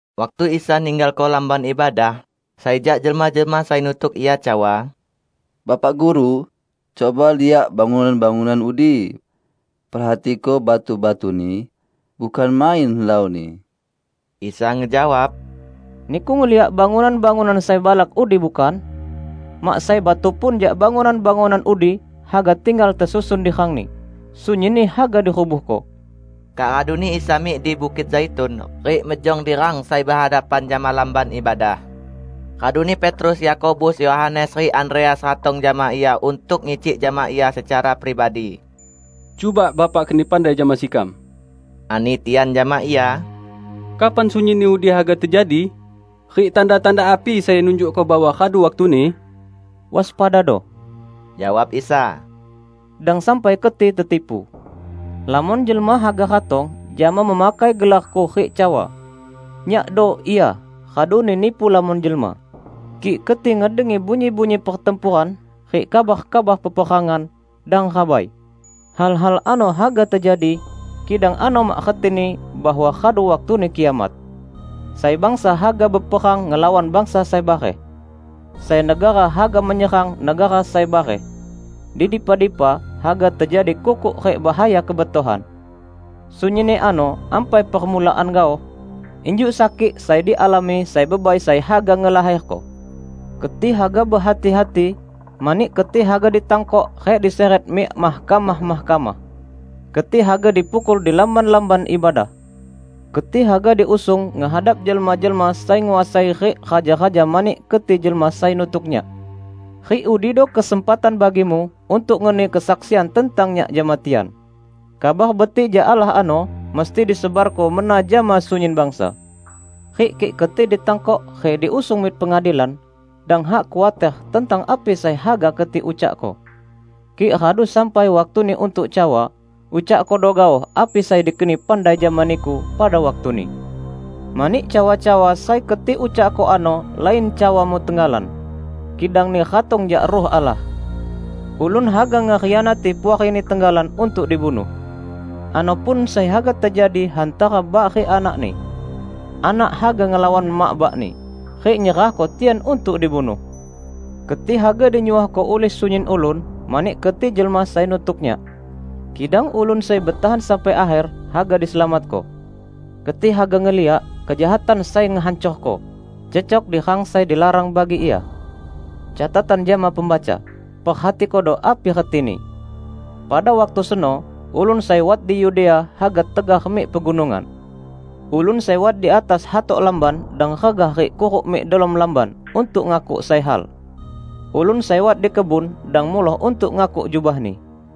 Waktu Isa ninggalko Lamban Ibadah, sai jak jelma-jelma sai nutuk Ia cawa, "Bapak Guru, cuba liak bangunan-bangunan udi. Perhatiko batu-batuni. Bukan main helauni!" Isa ngejawab, "Niku ngeliak bangunan-bangunan sai balak udi, bukan? Mak sai batu pun jak bangunan-bangunan udi haga tinggal tesusun di rangni. Sunyinni haga dirubuhko." Kak raduni Isa mik di Bukit Zaitun, rik mejong di rang sai behadapan jama Lamban Ibadah. Raduni Petrus, Yakobus, Yohanes, rik Andreas ratong jama Ia untuk ngicik jama Ia secara pribadi. "Cuba Bapak keni pandai jama sekam," ani tian jama Ia, "kapan sunyinni udi haga tejadi? Rik tanda-tanda api sai nunjukko bahwa radu waktuni?" "Waspadado," jawab Isa, "dang sampai keti ketipu. Lamon jelma haga ratong jama memakai gelar-Ku rik cawa, 'Nyakdo Ia!' raduni nipu lamon jelma. Kik keti ngedengi bunyi-bunyi pertempuran rik kabar-kabar peperangan, dang rabai. Hal-hal ano haga tejadi, kidang ano mak retini bahwa radu waktuni kiamat. Sai bangsa haga beperang ngelawan bangsa sai bareh. Sai negara haga menyerang negara sai bareh. Di dipa-dipa haga tejadi kukuk rik bahaya kebetohan. Sunyinni ano ampai permulaan gaoh, injuk sakik sai dialami sai bebai sai haga ngelaherko. Keti haga behati-hati, mani keti haga ditangkok rik disiret mik mahkamah-mahkamah. Keti haga dipukul di lamban-lamban ibadah. Keti haga diusung ngehadap jelma-jelma sai nguasai rik raja-raja mani keti jelma sai nutuk Nyak. Rik udido kesempatan bagimu untuk ngeni kesaksian tentang Nyak jama tian. Kabar Betik jak Allah ano musti disebarko mena jama sunyin bangsa. Rik kik keti ditangkok rik diusung mik pengadilan, dang hak khuater tentang api sai haga keti ucakko. Kik radu sampai waktuni untuk cawa, ucakkodo gaoh api sai dikeni pandai jama niku pada waktuni. Mani cawa-cawa sai keti ucakko ano lain cawamu tenggalan, kidangni ratong jak Ruh Allah. Ulun haga ngekhianati puarini tenggalan untuk dibunuh. Ano pun sai haga tejadi hantara bak rik anakni. Anak haga ngelawan mak bakni, rik nyerahko tian untuk dibunuh. Keti haga dinyuohko ulih sunyin ulun mani keti jelma sai nutuk Nyak. Kidang ulun sai betahan sampai akher, haga diselamatko." "Keti haga ngeliak 'Kejahatan sai Ngehancorko' cecok di rang sai dilarang bagi ia. (Catatan jama pembaca: Perhatikodo api retini!) Pada waktu seno ulun sai wat di Yudea haga tegar mik pegunungan. Ulun sai wat di atas hatok lamban dang regah rik kuruk mik delom lamban untuk ngakuk sai hal. Ulun sai wat di kebun dang muloh untuk ngakuk jubahni.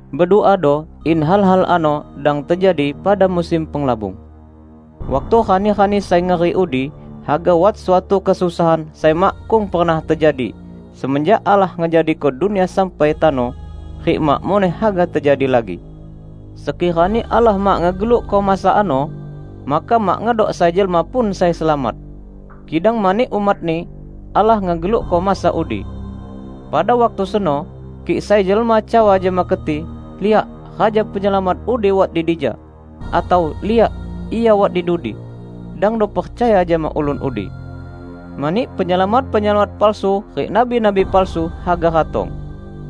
Beduado in hal-hal ano dang tejadi pada musim penglabung. Waktu rani-rani sai ngeri udi haga wat suatu kesusahan sai makkung pernah tejadi, semenjak Allah ngejadiko dunia sampai tano, rik mak muneh haga tejadi lagi. Sekirani Allah mak ngegelukko masa ano, maka mak ngedok sai jelma pun sai selamat. Kidang mani umat-Ni, Allah ngegelukko masa udi. Pada waktu seno kik sai jelma cawa jama keti, 'Liak, Raja Penyelamat udi wat di dija!' atau 'Liak, Ia wat di dudi!' -- dangdo percaya jama ulun udi. Mani penyelamat-penyelamat palsu rik nabi-nabi palsu haga ratong.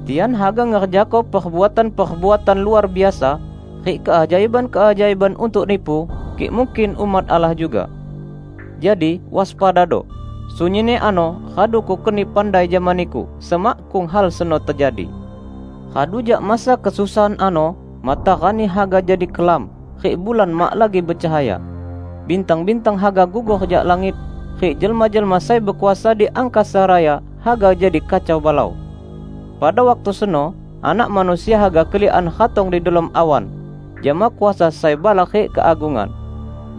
Tian haga ngerjako perbuatan-perbuatan luar biasa rik keajaiban-keajaiban untuk nipu kik mungkin, umat Allah juga. Jadi, waspadado! Sunyinni ano radu Kukeni pandai jama niku semakkung hal seno tejadi." "Radu jak masa kesusahan ano, matarani haga jadi kelam, rik bulan mak lagi becahaya. Bintang-bintang haga gugor jak langit, rik jelma-jelma sai bekuasa di angkasa raya haga jadi kacau balau. Pada waktu seno Anak Manusia haga keliakan ratong di delom awan jama kuasa sai balak rik keagungan.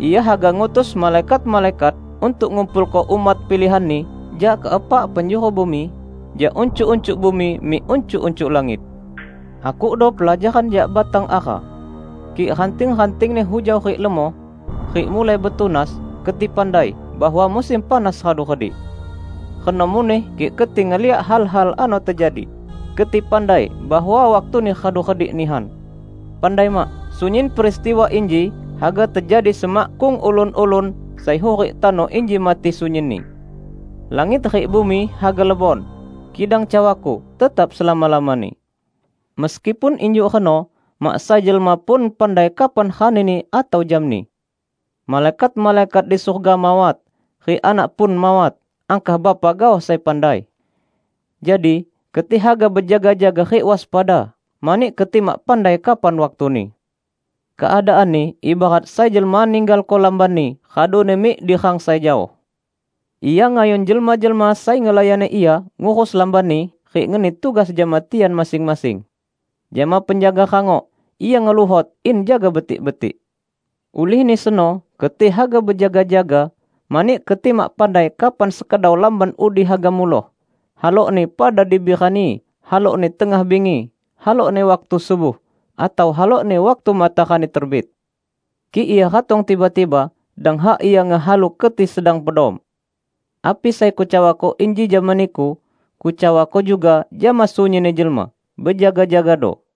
Ia haga ngutus malaikat-malaikat untuk ngumpulko umat pilihan-Ni jak keepak penjuru bumi, jak uncuk-uncuk bumi mik uncuk-uncuk langit." "Akukdo pelajaran jak batang ara. Kik ranting-rantingni hujau rik lemoh, rik mulai betunas, keti pandai bahwa musim panas radu redik. Reno muneh kik keti ngeliak hal-hal ano tejadi, keti pandai bahwa waktuni radu redik nihan. Pandai mak! Sunyin peristiwa inji haga tejadi semakkung ulun-ulun sai hurik tano inji mati sunyinni. Langit rik bumi haga lebon, kidang cawa-Ku tetap selama-lamani." "Meskipun injuk reno, mak sai jelma pun pandai kapan ranini atau jamni. Malaikat-malaikat di surga mawat, rik Anak pun mawat, angkah Bapa gaoh sai pandai. Jadi keti haga bejaga-jaga rik waspada, mani keti mak pandai kapan waktuni. Keadaanni ibarat sai jelma ninggalko lambanni raduni mik di rang sai jaoh. Ia ngayun jelma-jelma sai ngelayani ia ngurus lambanni, rik ngeni tugas jama tian masing-masing. Jama penjaga rangok, ia ngeluhot in jaga betik-betik. Ulihni seno keti haga bejaga-jaga, mani keti mak pandai kapan sekedau lamban udi haga muloh -- halokni pada dibi rani, halokni tengah bingi, halokni waktu subuh, atau halokni waktu matarani terbit. Kik ia ratong tiba-tiba, dang hak ia ngehalu keti sedang pedom. Api sai Kucawako inji jama niku, Kucawako juga jama sunyinni jelma: bejaga-jagado!"